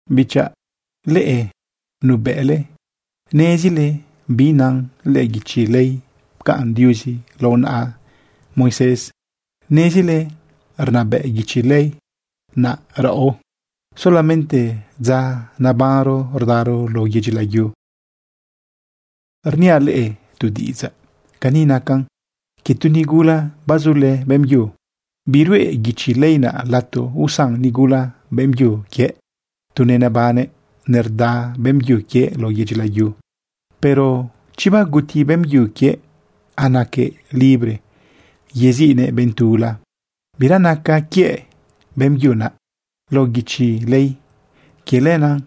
Bichaꞌ, leꞌe nuebëꞌle nezile bi nan lëꞌë guichi ley pcaꞌn Diuzi lao naꞌa Moisés. Nezile rnabëꞌ guichi ley naꞌ raꞌo solamente dza nebanro rdaro lao yedyi layu. Rniaꞌ leꞌe tu diꞌidzaꞌ. Cani nacan quie tu nigula bazulë beꞌmbyu. Biruꞌe guichi ley naꞌ lato usan nigula beꞌmbyu quiëꞌ tu nenebannëꞌ nerda beꞌmbyu quiëꞌ lao yedyi layu. Pero chi baguti beꞌmbyu quiëꞌ, anaquëꞌ libre yeziꞌnëꞌ benꞌ tula. Bira naca quiëꞌ beꞌmbyu naꞌ lao guichi ley. Quie lenaꞌ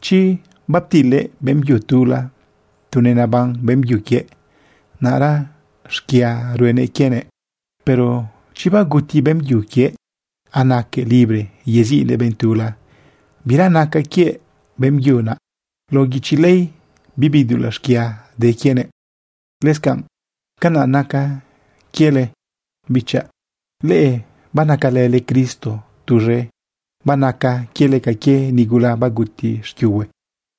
chi baptilëꞌ beꞌmbyu tula tu neneban beꞌmbyu quiëꞌ, naꞌra xquia ruenëꞌ quienëꞌ. Pero chi baguti beꞌmbyu quiëꞌ, anaquëꞌ libre yeziꞌnëꞌ benꞌ tula, bira naca quiëꞌ beꞌmbyu naꞌ lao guichi ley. Bibi dulaꞌ xquia de quienëꞌ. Lëscanꞌ canaꞌ nacan quiele, bichaꞌ. Leꞌe banacalële Cristo tuz̃e. Banaca quiele ca quie nigula baguti xquiuhue.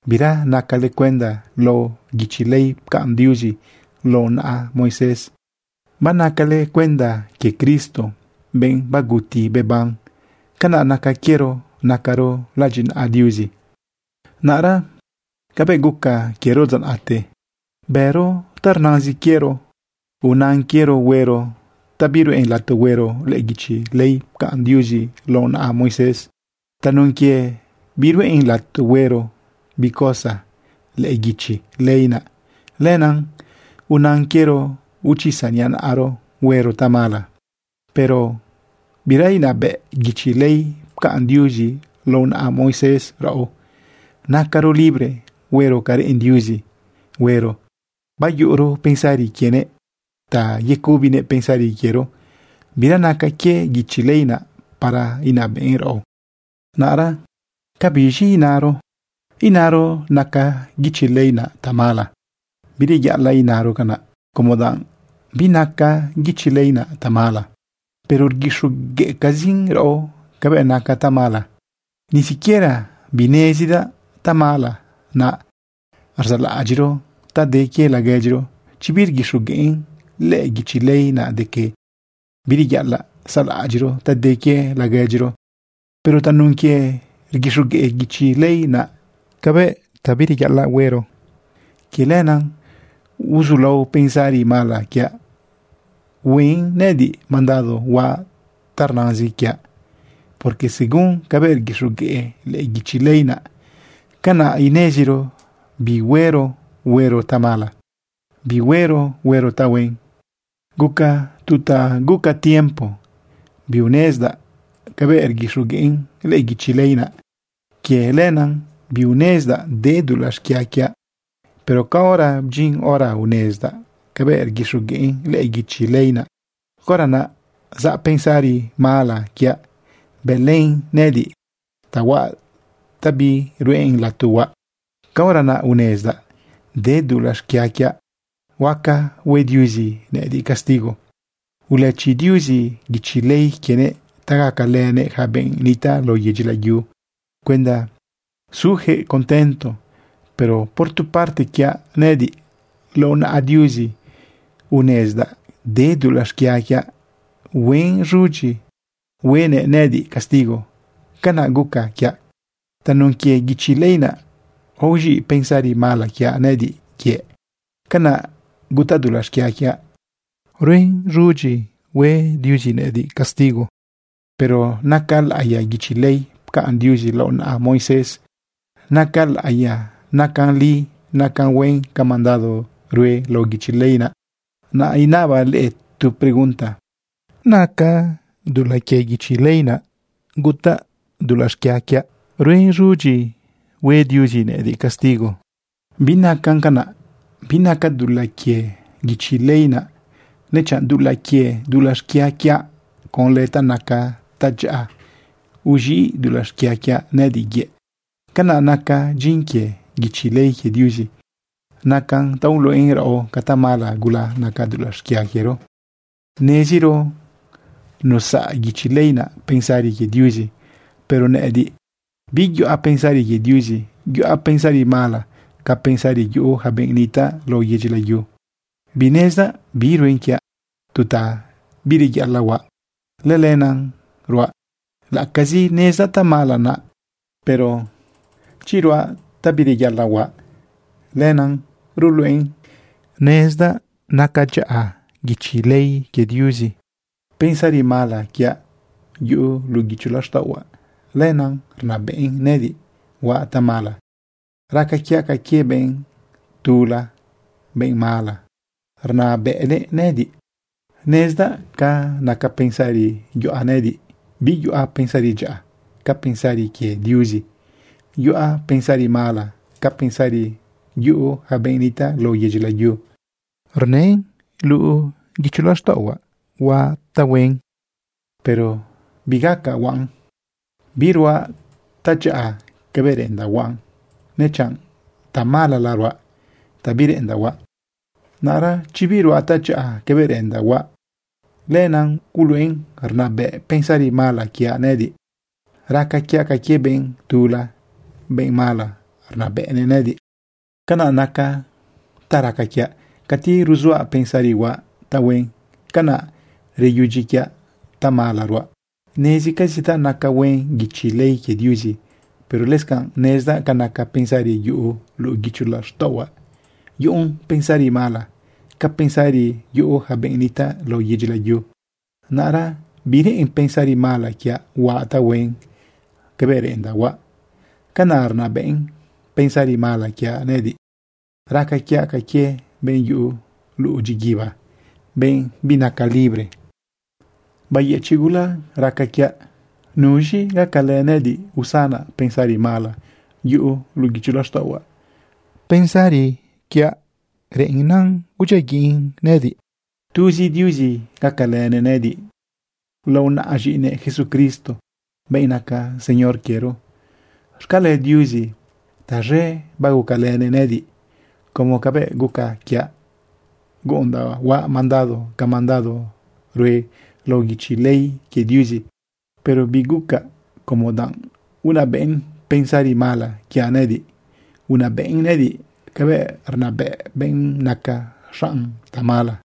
Bira nacale cuenda lao guichi ley pcaꞌn Diuzi lao naꞌa Moisés. Banacale cuenda quie Cristo, benꞌ baguti beban. Canaꞌ naca quiero nacaro ladyinaꞌa Diuzi. Naꞌra cabëꞌ guca quiero dza naꞌte, bëro ta rnazin quiero. Unan quiero huero ta biruꞌen lato huero lëꞌë guichi ley pcaꞌn Diuzi lao naꞌa Moisés. Tanun quie biruꞌen lato huero bi cosa lëꞌë guichi ley naꞌ, lenaꞌ unan quiero uchisa niꞌa naꞌaro huero tamala. Pero bira inabëꞌ guichi ley pcaꞌn Diuzi lao naꞌa Moisés raꞌo. Nacaro libre huero ca reꞌen Diuzi huero, bayuꞌuro pensari quienëꞌ ta yecubinëꞌ pensari quiero. Bira naca quie guichi ley naꞌ para inabëꞌn raꞌo. Naꞌra, ¿ca biz̃i inaro? ¿Inaro naca guichi ley naꞌ tamala? ¡Bireyaꞌalaꞌ inaro canaꞌ como danꞌ binaca guichi ley naꞌ tamala! Pero rguixogueꞌcazin raꞌo cabëꞌ naca tamala. Ni siquiera binezidaꞌ tamala naꞌ rzaꞌlaꞌadyiꞌro ta de quie laguedyiro, chi birguixogueꞌn lëꞌë guichi ley naꞌ de que: “Bireyaꞌalaꞌ saꞌlaꞌadyiꞌro ta de quie laguedyiro.” Pero tanun quie rguixogueꞌ guichi ley naꞌ cabëꞌ bireyaꞌalaꞌ huero, quie lenaꞌ uzulao pensari mala quiaꞌ huen nëꞌëdiꞌ mandado huaꞌ ta rnazin quiaꞌ. Porque según cabëꞌ rguixogueꞌ lëꞌë guichi ley naꞌ, canaꞌ ineziro bi huero huero tamala, bi huero huero tahuen. Guca tu ta guca tiempo biunezdaꞌ cabëꞌ rguixogueꞌn lëꞌë guichi ley naꞌ. Quie lenaꞌ biunezdaꞌ de dulaꞌ xquia quiaꞌ. Pero caora bdyin hora unezdaꞌ cabëꞌ rguixogueꞌn lëꞌë guichi ley naꞌ, caora naꞌ zaꞌ pensari mala quiaꞌ, bëlën nëꞌëdiꞌ ta huaꞌ ta biruꞌen lato huaꞌ. Caora naꞌ unezdaꞌ de dulaꞌ xquia quiaꞌ, huaca hue Diuzi nëꞌëdiꞌ castigo. Ulëchi Diuzi guichi ley quienëꞌ ta gacalënëꞌ yaca benꞌ nitaꞌ lao yedyi layu cuenda suyaquëꞌ contento. Pero por tu parte quiaꞌ nëꞌëdiꞌ, lao naꞌa Diuzi unezdaꞌ de dulaꞌ xquia quiaꞌ, huen z̃udyi huenëꞌ nëꞌëdiꞌ castigo. Canaꞌ guca quiaꞌ. Tanun quie guichi ley naꞌ, aoz̃iꞌ pensari mala quiaꞌ nëꞌëdiꞌ yëꞌ. Canaꞌ gutaꞌ dulaꞌ xquia quiaꞌ, bën z̃udyi hue Diuzi nëꞌëdiꞌ castigo. Pero naca laꞌiya guichi ley pcaꞌn Diuzi lao naꞌa Moisés. Naca laꞌiyan, nacan li, nacan huen ca mandado rue lao guichi ley naꞌ. Naꞌ inabaꞌ leꞌe tu pregunta, ¿naca dulaꞌ quie guichi ley naꞌ gutaꞌ dulaꞌ xquia quiaꞌ, huen z̃udyi hue Diuzi nëꞌëdiꞌ castigo? ¡Binacan canaꞌ! Binaca dulaꞌ quie guichi ley naꞌ, nechanꞌ dulaꞌ quie dulaꞌ xquia quiaꞌ. Conlë ta naca tadyaꞌa uz̃iꞌ dulaꞌ xquia quiaꞌ nëꞌëdiꞌ yëꞌ. Canaꞌ naca dyin quie guichi ley quie Diuzi. Nacan ta uluꞌen raꞌo ca tamala gula naca dulaꞌ xquia quiero. Neziro nusaꞌa guichi ley naꞌ pensari quie Diuzi, pero nëꞌëdiꞌ biyuꞌa pensari quie Diuzi, yuꞌa pensari mala ca pensari yuꞌu yaca benꞌ nitaꞌ lao yedyi layu. Binezdaꞌ bi ruen quiaꞌ. Tu ta bireyaꞌalaꞌ huaꞌ, lëlenaꞌ ruaꞌ, laꞌacazi nezdaꞌ tamala naꞌ. Pero chi ruaꞌ tu ta bireyaꞌalaꞌ huaꞌ, lenaꞌ ruluꞌen nezdaꞌ naca dyaꞌa guichi ley quie Diuzi. Pensari mala quiaꞌ yuꞌu luꞌu guicho laxtaꞌohuaꞌ, lenaꞌ rnabëꞌn nëꞌëdiꞌ huaꞌ tamala. Raca quiaꞌ ca quie benꞌ tula, benꞌ mala, rnabëꞌnëꞌ nëꞌëdiꞌ. Nezdaꞌ ca naca pensari yuꞌa nëꞌëdiꞌ. Biyuꞌa pensari dyaꞌa ca pensari quie Diuzi. Yuꞌa pensari mala ca pensari yuꞌu yaca benꞌ nitaꞌ lao yedyi layu. Rnën luꞌu guicho laxtaꞌohuaꞌ huaꞌ tahuen, pero bigacaꞌ huaꞌn. Biruaꞌ tadyaꞌa cabëꞌ reꞌendaꞌ huaꞌ, nechanꞌ tamalala ruaꞌ, ta bireꞌendaꞌ huaꞌ. Naꞌra chi biruaꞌ tadyaꞌa cabëꞌ reꞌendaꞌ huaꞌ, lenaꞌ uluꞌen rnabëꞌn pensari mala quiaꞌ nëꞌëdiꞌ. Raca quiaꞌ ca quie benꞌ tula, benꞌ mala rnabëꞌnëꞌ nëꞌëdiꞌ. Canaꞌnaca ta raca quiaꞌ. Cati ruzuaꞌ pensari huaꞌ tahuen, canaꞌ reyudyi quiaꞌ tamalala ruaꞌ. Nezicazidaꞌ naca huen guichi ley quie Diuzi. Pero lëscanꞌ nezdaꞌ ca naca pensari yuꞌu luꞌu guicho laxtaꞌohuaꞌ, yuꞌun pensari mala ca pensari yuꞌu yaca benꞌ nitaꞌ lao yedyi layu. Naꞌra bireꞌen pensari mala quiaꞌ huaꞌ tahuen cabëꞌ reꞌendaꞌ huaꞌ. Canaꞌ rnabëꞌn pensari mala quiaꞌ nëꞌëdiꞌ. Raca quiaꞌ ca quie benꞌ yuꞌu luꞌu dyiguiba, benꞌ binaca libre. ¡Bayëchiꞌ gula raca quiaꞌ! ¿Nuz̃i gacalë nëꞌëdiꞌ usanaꞌ pensari mala yuꞌu luꞌu guicho laxtaꞌohuaꞌ, pensari reꞌen udyiaguiꞌn nëꞌëdiꞌ? Tuzi Diuzi gacalënëꞌ nëꞌëdiꞌ lao naꞌa z̃iꞌinëꞌ Jesucristo, benꞌ naca Señor quiero. ¡Xcale Diuzi taz̃e bagucalënëꞌ nëꞌëdiꞌ como cabëꞌ guca quiaꞌ, guꞌundaꞌ huaꞌ mandado ca mandado rue lao guichi ley quie Diuzi, pero bigucaꞌ como danꞌ unabëꞌn pensari mala quiaꞌ nëꞌëdiꞌ. Unabëꞌn nëꞌëdiꞌ cabëꞌ rnabëꞌ benꞌ naca xaꞌn tamala.